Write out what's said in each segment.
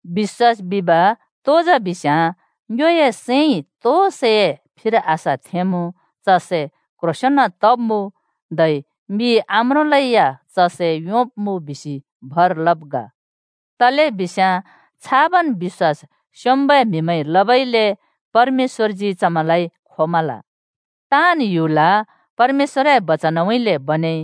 बिश्‍वास बिब तो जा बिस्‍याँ ङ्योए सैंइ तो सैए फिर आशा थेंमुँ च सै क्ह्रोंसेंन तब्‍मुँ, धै मिइ आम्रोंलै या च सै योंब्‍मुँ बिसि भर लब् ग। तलेबिस्याँ छाबन् बिश्‍वास स्‍योंम्‍बै म्‍हिमैंइ लबइले परमेश्‍वरजी चमैंलाइ खोमल। ताँन् ह्‍युल परमेश्‍वरए बचनउँइँले बनेइ,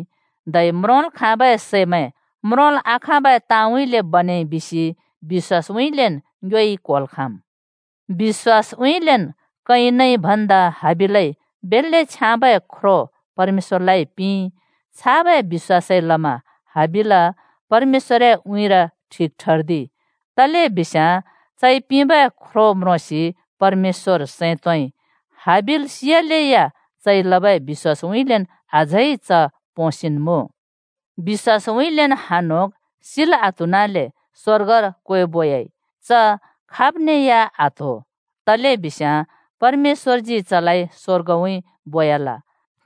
धै म्रोंल् खाँबै सैमैं म्रोंल् आखाँबै ताँउँइँले बनेइ बिसि बिश्‍वासउँइँलेन् ङ्योइ क्होल् खाँम्। बिश्‍वासउँइँलेन् कयिनइ भन्दा हाबिलइ बेल्‍ले छ्याँबै ख्रो परमेश्‍वरलाइ पिंइ। छाबै बिश्‍वासइ लमा हाबिल परमेश्‍वरए उँइँर ठिक ठर्दिइ, तलेबिस्याँ चइ पिंबै ख्रो म्रोंसि परमेश्‍वर सैं तोंइ। हाबिल सियालेया चइ लबै बिश्‍वासउँइँलेन् अझै च पोंसिन्मुँ। बिश्‍वासउँइँलेन् हनोक सिल् आत्हुनले स्‍वर्गर क्वेबोयाइ। चलाइ खाबज्यै या आत्हो, तलेबिस्याँ परमेश्‍वरजी चलाइ स्‍वर्गउँइँ बोयाल।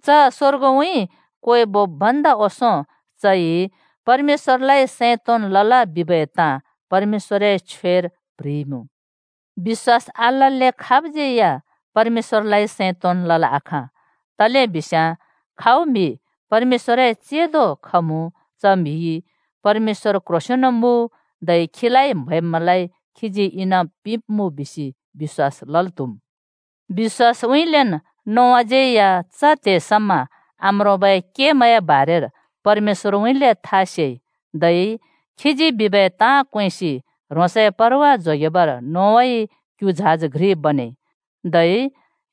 च स्‍वर्गउँइँ क्वेबोब् भन्दा ओंसों चइ परमेश्‍वरलाइ सैं तोंन् लल बिबै ताँ परमेश्‍वरए छ्वेर प्ह्रिइमुँ। बिश्‍वास आलल्‍ले खाबज्‍यै या परमेश्‍वरलाइ सैं तोंन् लल् आखाँ। तलेबिस्याँ खाउ म्हि परमेश्‍वरए चेंदो खमुँ च म्हिइ “परमेश्‍वर क्ह्रोंसेंन मुँ धै खीलाइ म्‍हैब्मैंलाइ खीजी इनाम पिंब्‍मुँ,” बिसि बिश्‍वास लल् त्‍हुम्। बिश्‍वासउँइँलेन् नोआज्यै च त्हे समा आम्रोंबै केमैंए बारेर परमेश्‍वरउँइँले था सेइ। धै खीजी बिबै ताँ क्वेंसि ह्रोंसए परवा जोगेबर नोआइ क्‍यु झाज घ्रि बनेइ। धै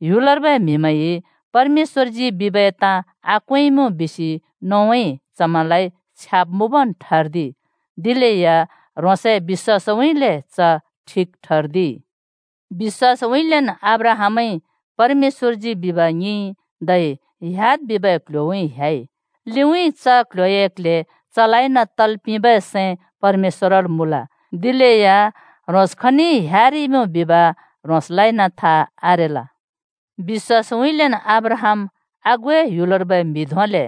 “ह्‍युलर्बै म्‍हिमैंइ परमेश्‍वरजी बिबै ताँ आक्वेंइमुँ,” बिसि नोआइ चमैंलाइ छ्याब् मुँबन् ठर्दिइ, दिलेया ह्रोंसए बिश्‍वासउँइँले च ठिक ठर्दिइ। बिश्‍वासउँइँलेन् अब्राहामइ परमेश्‍वरजी बिब ङिंइ, धै ह्‍याद् बिबै क्ल्ह्‍योउँइँ ह्‍याइ। लिउँइँ च क्ल्ह्‍योए क्ल्हे चलाइन तल् पिंबै सैं परमेश्‍वरल् मुँल। दिलेया ह्रोंस खनइ ह्‍यारिइमुँ बिब ह्रोंसलाइन था आरेल। बिश्‍वासउँइँलेन् अब्राहाम आगुए ह्‍युलर्बै म्हि धोंले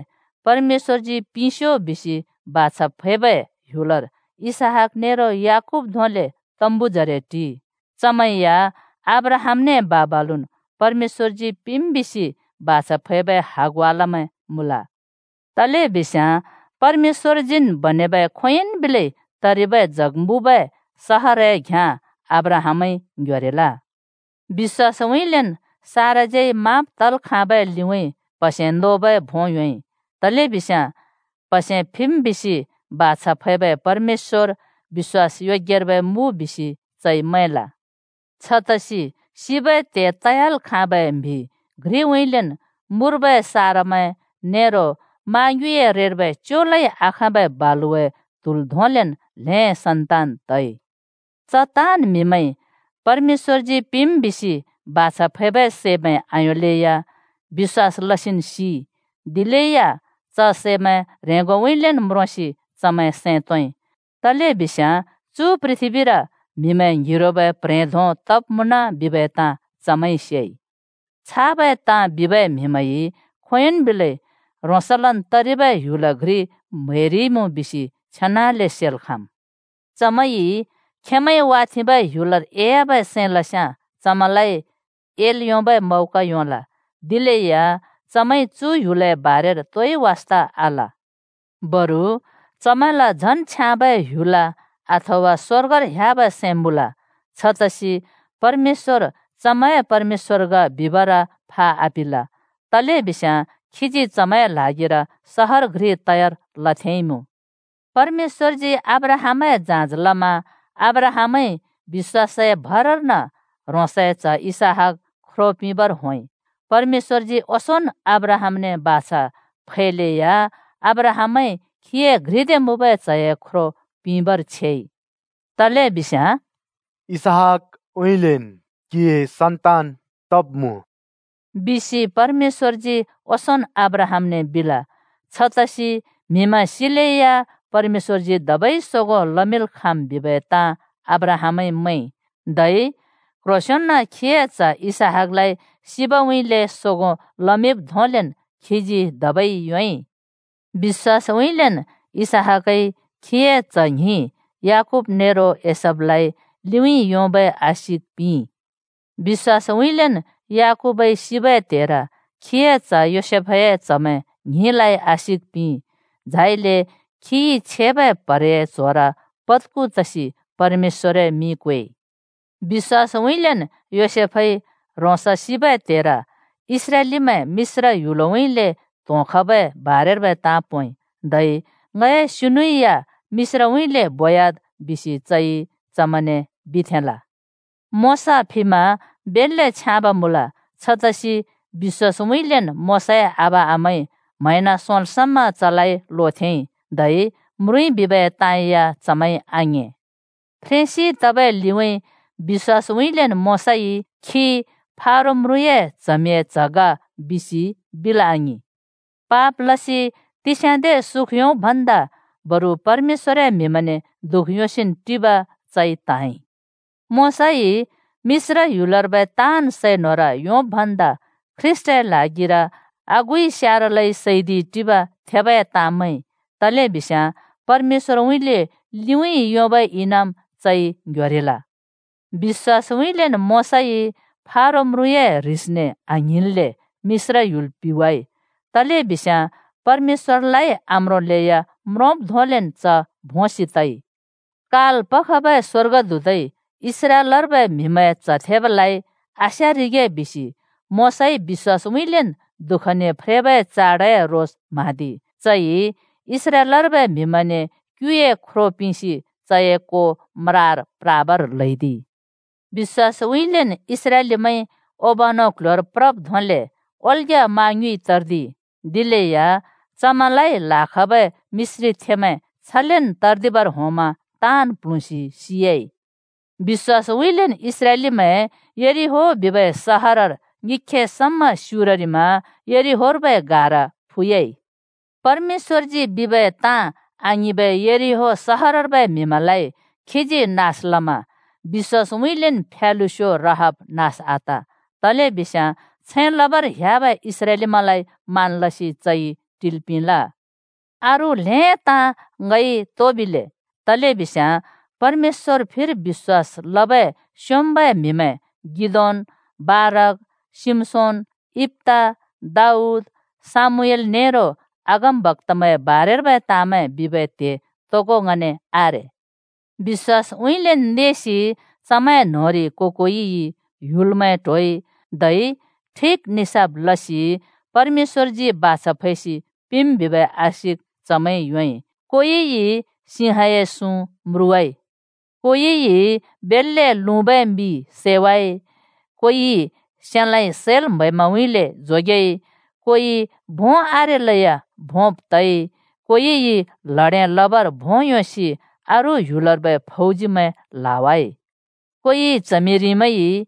परमेश्‍वरजी पिंस्‍यो बिसि बाछा फैबै ह्‍युलर टिइ। इसहाक नेरो याकूब धोंले च तम्बुजरे टिइ। चमैं या अब्राहामने बा-बालुन् परमेश्‍वरजी पिंम् बिसि बाछा फैबै हगवालमैं मुँल। तलेबिस्याँ परमेश्‍वरजीन् बनेबै खोंयोंइ बिलै तरिबै जग मुँबै सहरए घ्याँ अब्राहामइ ङ्ह्‍योरिल। बिश्‍वासउँइँलेन् साराज्यै माँब् तल् खाँबै लिउँइँ प्‍हसे नोबै भों योंइ, तलेबिस्याँ “प्हसे फिम् बिसि बाछा फैबै परमेश्‍वर बिश्‍वास योग्यर्बै मुँ” बिसि चइ मैंल। छतसि सिबै त्हे तयाल खाँबै म्हि घ्रिउँइँलेन् मुर्बै सारमैं नेरो मा ङ्युँइए रेर्बै च्योलै आखाँबै बालुवाए त्हुल धोंलेन् ल्हें सन्तान तइ। च ताँन् म्‍हिमैंइ परमेश्‍वरजी पिंम् बिसि बाछा फैबै सैंमैं आयोंलेया बिश्‍वास लसिन् सिइ, दिलेया च सैमैं ह्रेंगोउँइँलेन् म्रोंसि चमैं सैं तोंइ। तलेबिस्याँ चु पृथ्बीर म्हिमैं ङ्हिरोबै प्ह्रें धों तब् मुँन बिबै ताँ चमैंइ सेइ। छाबै ताँ बिबै म्हिमैंइ खोंयोंन् बिलै ह्रोंसलन् तरिबै ह्‍युल घ्रि म्हैरिइमुँ बिसि छेनाले सेल् खाँम्। चमैंइ खेंमैंइ वाथेंबै ह्‍युलर एयाबै सैं लस्‍याँ चमैंलाइ एल् योंबै मौका योंल, दिलेया चमैंइ च ह्‍युलए बारेर तोइ वास्‍ता आल। बरु चमैंल झन् छ्याँबै ह्‍युल, अथवा स्‍वर्गर, ह्‍याबै सैं मुँल। छतसि परमेश्‍वर “चमैंए परमेश्‍वर ग” बिबर फा आपिल, तलेबिस्याँ खीजी चमैंए ल्हागिर सहर घ्रि तयार लथेंइमुँ। परमेश्‍वरजी अब्राहामए जाँच लमा अब्राहामइ बिश्‍वासए भरर्न ह्रोंसए च्ह इसहाक ख्रो पिंबर होंइ। परमेश्‍वरजी ओंसोंन् अब्राहामने बाछा फैलेया अब्राहामइ खीए घ्रिदे मुँबै च्‍हए ख्रो पिंबर छेइ, तलेबिस्याँ “इसहाकउँइँलेन् क्हिए सन्तान तब्मुँ,” बिसि परमेश्‍वरजी ओंसोंन् अब्राहामने बिल। छतसि म्हिमैं सिलेया परमेश्‍वरजी धबै सोगों लमिंल् खाँम् बिबै ताँ अब्राहामइ मैंइ, धै क्ह्रोंसेंन चए च्‍ह इसहाकलाइ सिबउँइँले सोगो लमिब् धोंलेन् चइ धबै योंइ। बिश्‍वासउँइँलेन् इसहाकइ चए च्‍ह ‍ङ्हिं याकूब नेरो एसावलाइ लिउँइँ योंबै आशिक पिंइ। बिश्‍वासउँइँलेन् याकूबइ सिबै त्हेर चए च्ह योसेफए च्‍हमैं ङ्हिंलाइ आशिक पिंइ। झाइले चइ छेबै प्हरेए च्होर पत्खु तसि परमेश्‍वरए मिं क्वेइ। बिश्‍वासउँइँलेन् योसेफइ ह्रोंस सिबै त्हेर इस्राएलीमैं मिश्र ह्‍युलउँइँले त्‍होंखबै बारेर्बै ताँ पोंइ। धै “ङए सिनु या मिश्रउँइँले बोयाद्,” बिसि चइ चमैंने बिथेंल। मोशा फिमा बेल्‍ले छ्याँब मुँल। छतसि बिश्‍वासउँइँलेन् मोशाए आबा-आमाइ म्हैंन सोंल् समा चलाइ लोथेंइ। धै म्रुँइ बिबै ताँ या चमैंइ आङिं। फ्रेंसि तबै लिउँइँ बिश्‍वासउँइँलेन् मोशाइ “च फारो म्रुँए च्हमिंए च्‍ह ग,” बिसि बिल् आङिं। पाप लसि तिस्याँदे सुख योंब् भन्दा बरु परमेश्‍वरए म्‍हिमैंने दुःख योंसिन् टिब चइ त्‍हाँइ। मोशाइ मिश्र ह्‍युलर्बै ताँन् सै न्होर योंब् भन्दा ख्रीष्‍टए ल्हागिर आगुइ स्यारलै सैदिइ टिब थेबै ताँ मैंइ, तलेबिस्याँ परमेश्‍वरउँइँले लिउँइँ योंबै इनाम चइ ङ्ह्‍योरिल। बिश्‍वासउँइँलेन् मोशाइ फारो म्रुँए ह्रिसने आङ्हिंन्‍ले मिश्र ह्‍युल पिवाइ, तलेबिस्याँ परमेश्‍वरलाइ आम्रोंलेया म्रोंब् धोंलेन् च भोंसि तइ। काल पखबै स्‍वर्गदूतइ इस्राएलर्बै म्‍हिमैंए च्‍ह थेबालाइ आस्‍यारिगे बिसि मोशाइ बिश्‍वासउँइँलेन् दुःखने फ्रेबै चाडए रोस म्हाँदिइ। चइ इस्राएलर्बै म्‍हिमैंने क्‍युए ख्रो पिंसि चए को म्रार प्राबर ल्हैदिइ। बिश्‍वासउँइँलेन् इस्राएलीमैंइ ओबानो क्ल्ह्‍योर प्रब् धोंले ओल्ग्या मा ङ्युँइ तर्दिइ, दिलेया चमैंलाइ ल्‍हाखबै मिश्रीथेंमैं छलेन् तर्दिबर होंमा ताँन् प्ल्हुँसि सियाइ। बिश्‍वासउँइँलेन् इस्राएलीमैं यरिहो बिबै सहरर ङिख्खे समा स्‍युररिमा यरिहोर्बै गाह्रा फुयाइ। परमेश्‍वरजी बिबै ताँ आङिंबै यरिहो सहरर्बै म्हिमैंलाइ खीजी नास लमा बिश्‍वासउँइँलेन् फ्यालुस्यो राहाब नास आत, तलेबिस्याँ छैं लबर ह्‍याबै इस्राएलीमैंलाइ मान लसि चइ टिल् पिंल। अरू ल्हें ताँ ङइ तो बिले? तलेबिस्याँ परमेश्‍वरए फिर बिश्‍वास लबै स्‍योंम्‍बै म्हिमैं गिदोन्, बाराक, शिमशोन, यिप्‍ता, दाऊद, शमूएल नेरो अगमबक्‍तामैंए बारेर्बै ताँमैं बिबै त्हे तोगो ङने आरे। बिश्‍वासउँइँलेन् नेसि चमैं न्‍होंरि को-कोइइ ह्‍युलमैं ट्होइ, धै ठिक निसाफ लसि परमेश्‍वरजी बाछा फैसि पिंम् बिबै आशिक चमैंइ योंइ। कोइइ सिंहए सुँ म्रुवाइ, कोइइ बेल्‍ले लुँबै मि सैवाइ, कोइ सेलाँइ (तरवारइ) सैल् म्‍हैब्मैंउँइँले जोगेइ, कोइ भों आरेलेया भोंब् तइ, कोइइ ल्हडें लबर भों योंसि अरू ह्‍युलर्बै फौजीमैं ल्‍हावाइ। कोइ च्हमिरिमैंइ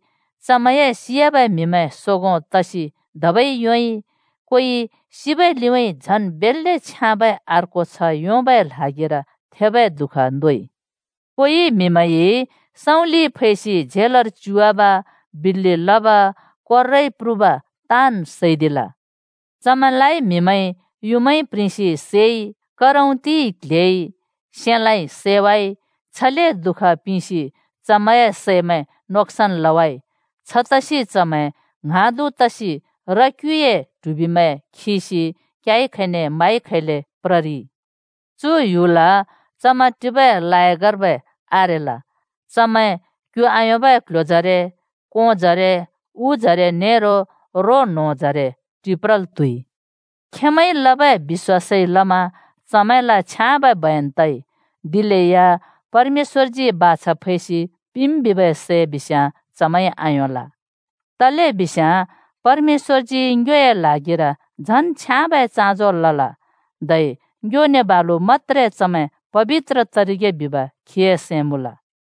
खेंमैंए सियाबै म्‍हिमैं सोगों तसि धबै योंइ। कोइ सिबै लिउँइँ झन् बेल्‍ले छ्याँबै अर्को छ्ह योंबै ल्हागिर थेबै दुःख नोइ। कोइलाइ म्हिमैंइ सँउँलिइ फैसि झेलर च्युवाब, बिल्‍लि लब, कोर्राए प्रुब ताँन् सैदिल। चमैंलाइ म्हिमैंइ युँमाइ प्रिंसि सैइ, करौंतिइ क्‍ल्हेइ, सेलाँइ सैवाइ। छले दुःख पिंसि चमैंए सैमैं नोक्‍सान लवाइ। छतसि चमैं ङ्हाँदु तसि र-क्‍युए ट्हुबिमैं खिसि क्याइ खैने माइ खेले प्ररिइ। (चु ह्‍युल चमैं टिबै लायकबै आरेल!) चमैं क्यु आयोंबै क्ल्ह्‍योजरे, कोंजरे, उजरे नेरो रो न्होंजरे टिप्रल् त्‍हुइ। खेंमैंइ लबै बिश्‍वासइ लमा चमैंल छ्याँबै बयन तइ। दिलेया परमेश्‍वरजी बाछा फैसि पिंम् बिबै सै बिस्याँ चमैंइ आयोंल। तलेबिस्याँ परमेश्‍वरजी ङ्योए ल्हागिर झन् छ्याँबै चाँजो लल, धै ङ्योने बालु मत्‍त्रे चमैं पबित्र तरिगे बिब खीए सैं मुँल।